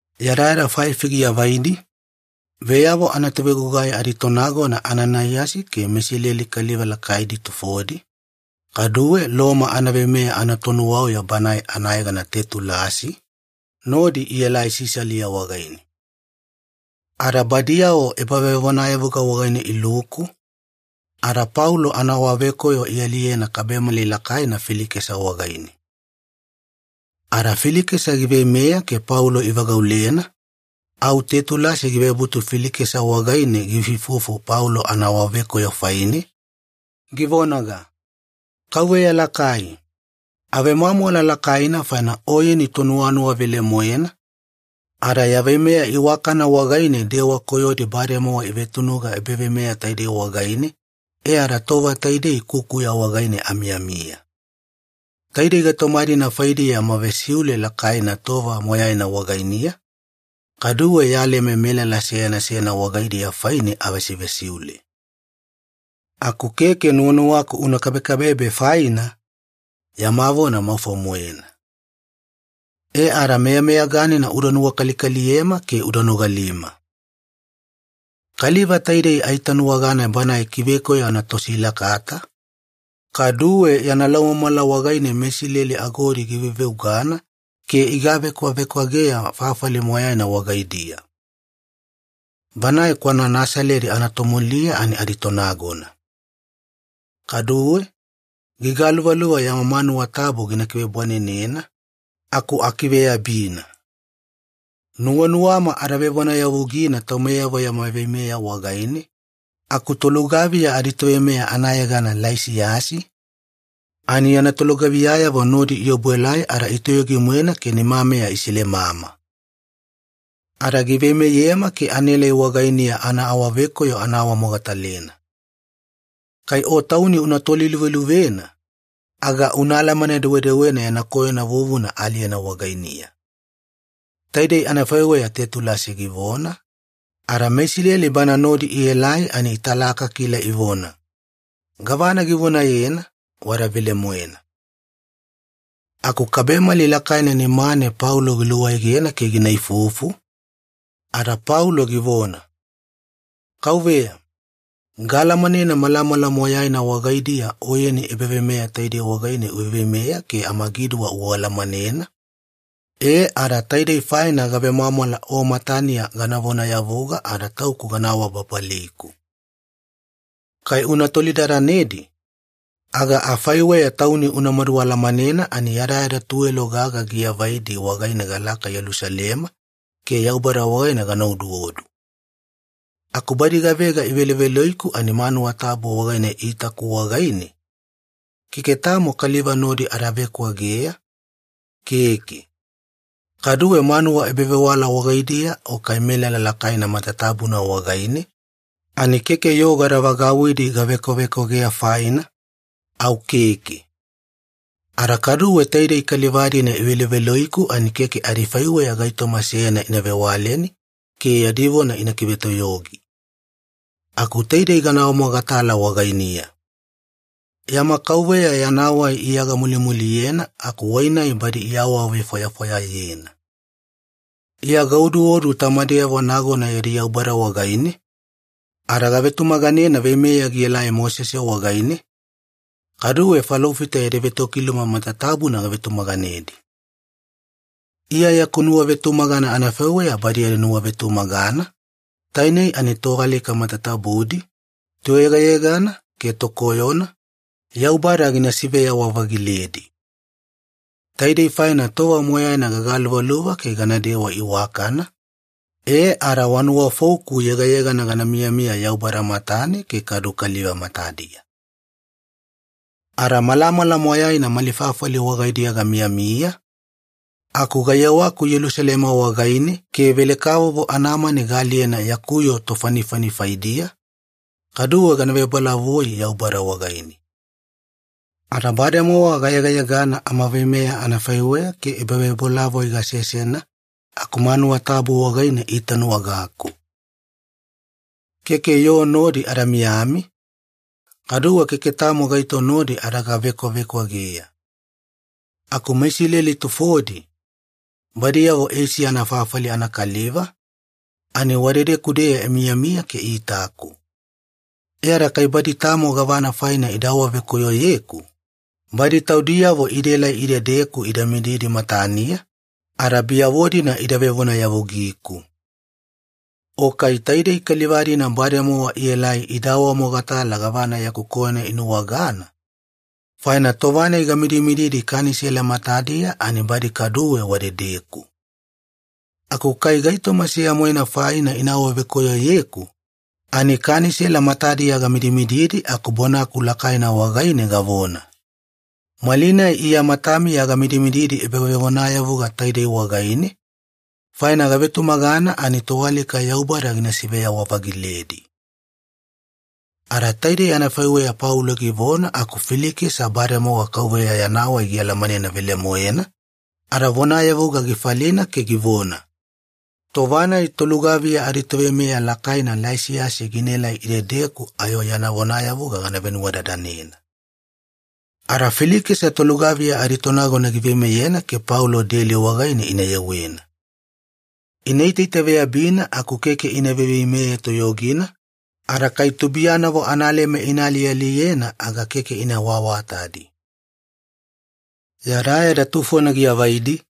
Yadayada faifi giavaidi, veyavo anatovegugai aditonagona Ananaiyasi ke meIsileli kaliva lakaidi tufodi, kaduwe Loma anaveimeya anatonuwauya banae anayegana Tetulasi, nodi ielai Sisalia wagaine. Ada badiyavo ebavevonayavuga wagaine iluku, ada Paulo anaawavekoyo ialiyena kabemali lakaina Filikesa wagaine. Ada Filikesa giveimeya ke Paulo ivagaulena, au Tetulasi givebutu Filikesa wagaine giifuifufu Paulo anaawavekoyo faine, givonaga, “Kauveya lakai, avemwamwala lakaina faina oyeni tonuwanuwa velemoena, ada ya veimeya iwakana wagaine dewa koyodi bademowa ivetunuga ebaveimeya taidei wagaine e ada tova taidei kukuya wagaine amiyamiya. Taidei gaitoma-dina faidiya yama vesiule lakaina tova moyaina wagainiya, kaduwe ya leme melala seyana seyana wagaidiya faine avesivesiule. Aku keke nuwanuwaku una kabekabebe faina, yama vona maufo-moena. E ada meyameyaganina uda nuwakalikaliyema ke uda nogalima. “Kaliva taidei aitanuwagana banae kivekoyo anatosilakata, kaduwe yana laumamala wagaine meIsileli agodi giveveugana ke igavekwavekwageya fafali moyaina wagaidiya. Banae kwana Nasaledi anatomuliya ani aditonagona. Kaduwe, gigaluvaluva yama manuwa tabu gina kivebwanenena, aku akiveyabina. Nuwanuwama ada vevonayavugina taumeyavo yama veimeya wagaine, aku tolugaviya aditoveimeya anayegana Laisiyasi, ani yana tolugaviyayavo nodi iobuelai ada itoyogi-moena ke nimameya isilemama. Ada giveimeyema ke anaelai wagainiya anaawavekoyo ana awamogatalena. Kai o tauni una toliluveluvena, aga una alamane-dewedewena yana koyona vuvuna aaliyena wagainiya.” Taidei anafaiweya Tetulasi givona, ada meIsileli bana nodi ielai ani italakakila ivona, “Gavana givonayena, wada velemoena.” Aku kabemali lakaina nimane Paulo giluawaegena ke gina ifufu, ada Paulo givona, “Kauveya, gaalamanena malamala moyaina wagaidiya oyeni ebaveimeya taidei wagaine uveiveimeya ke amagiduwa ualamanena, e ada taidei faina gavemwamwala o mataniya gana vonayavuga ada tauku gana awababaliku. Kai una tolidadanedi, aga afaiweya tauni unamadu alamanena ani yadayada tuwelo gaga giavaidi wagaine galaka Yelusalema ke Yaubada wagaine gana oduodu. Aku badi gavega iveloveloiku ani manuwa tabu wagaine iitaku wagaine, keke tamo kaliva nodi ada vekwageya, keke. Kaduwe manuwa ebavewala wagaidiya o kai melala lakaina matatabuna wagaine, ani keke yoo gada vagauwidi gavekwavekwageya faina, au keke. Ada kaduwe taidei kaliva-dina iveloveloiku ani keke adifaiweya gaitoma seyana ina vewaleni ke yadi vona ina kivetoyogi. Aku taidei gana awamogatala wagainiya. Yama Kauveya Yana Wai Iya gamulimuliyena aku Wai-nai badi iawavefwayafwayayena. Iya gaoduodu tamameyavo nagona yadi Yaubada wagaine, ada gavetumaganena veimeya gielai Mosese wagaine, kaduwe falofita yadi vetokiluma matatabuna gavetumaganedi. Iya yaku nuwavetumagana anafaiweya badi yadi nuwavetumagana, tainei ani toalika matatabudi, toyegayegana ke tokoyona, Yaubada gina siveyawa-vagiledi. Taidei faina tova moyaina gagaluvaluva ke ganadewa iwakana, e ada wa nuwafouku yegayegana gana miyamiya Yaubada matane ke kadu kaliva matadiya. “Ada malamala moyaina mali fafali wagaidiya gamiyamiya, aku gayewaku Yelusalema wagaine ke velekavovo anamani gana aliyena yaku yoo tofanifani faidiya, kaduwe gana vebolavoi Yaubada wagaine. Ada bademowa gayegayegana amaveimeya anafaiweya ke ebavebolavoi gasesena aku manuwa tabu wagaine iitanuwagaku. Keke yoo nodi ada miyami, kaduwe keke tamo gaito nodi ada gavekwavekwageya. Aku meIsileli tufodi, badiyavo Eisiya anafafali anakaliva, ani wadedeku-deya imiyamiya ke iitaku. E ada kai badi tamo gavana faina ida awavekoyoyeku, badi taudiyavo idaelai idedeku ida midimididi mataniya, ada biyavo-dina ida vevonayavugiku. O kai taidei kaliva-dina bademowa ielai ida awamogatala gavana yaku koyona inuwagana, faina tova-nai gamidimididi Kanisela matadiya ani badi kaduwe wadedeku. Aku kai gaitoma seya-moena faina ina awavekoyoyeku, ani Kanisela matadiya gamidimididi aku bonaku lakaina wagaine gavona, ‘Malinai Iya matamiya gamidimididi ebavevonayavuga taidei wagaine, faina gavetumagana ani toalika Yaubada gina siveyawa-vagiledi.’” Ada taidei anafaiweya Paulo givona aku Filikesa bademowa Kauveya Yana Wai gialamanena velemoena, ada vonayavuga gifalina ke givona, “Tova-nai tolugaviya aditoveimeya lakaina Laisiyasi ginaelai idedeku ayo ya vonayavuga gana venuwadadanena.” Ada Filikesa tolugaviya aditonagona giveimeyena ke Paulo deli wagaine ina yewena. Ina itaitaveyabina aku keke ina veiveimeye toyogina, ada kai tubuiyanavo analeme ina alialiyena aga keke ina awaawatadi. Yadayada tufona giavaidi,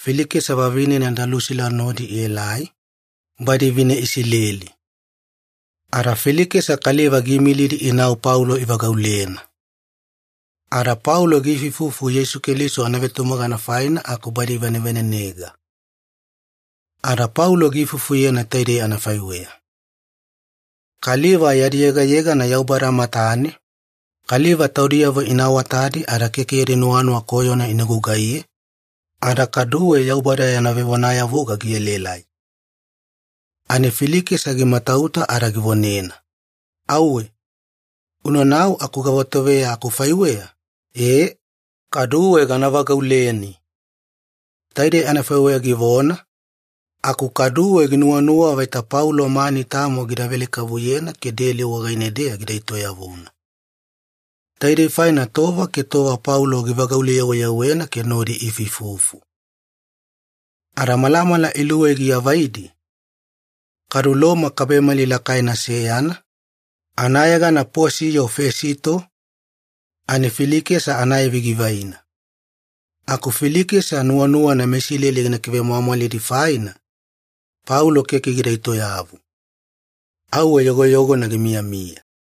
Filikesa vavinena Dalusila nodi ielai, badi vine Isileli. Ada Filikesa kaliva giimilidi inau Paulo ivagaulena. Ada Paulo giifuifufu Yeisu Keliso anavetumagana faina aku badi ivanevanenega. Ada Paulo giifufuyena taidei anafaiweya. Kaliva yadi yegayegana Yaubada matane, kaliva taudiyavo ina awatadi ada keke yadi nuwanuwa koyona ina gugaiye, ada kaduwe Yaubada yana vevonayavuga gielaelai. Ani Filikesa gimatauta ada givonena, “Auwe! Unanau aku gavatoveya akufaiweya, e, kaduwe gana vagauleni.” Taidei anafaiweya givona, aku kaduwe ginuwanuwa vaita Paulo mani tamo gida velekavuyena ke deli wagaine-deya gida etoyavuna. Taidei faina tova ke tova Paulo givagaule-yeweyewena ke nodi iifuifufu. Ada malamala iluwei giavaidi, kadu Loma kabemali lakaina seyana, anayegana Posiyo Fesito, ani Filikesa anaivi givaina. Aku Filikesa nuwanuwana meIsileli gina kivemwamwalidi faina, Paulo keke gida etoyavu. Auwe yogoyogona gimiyamiya.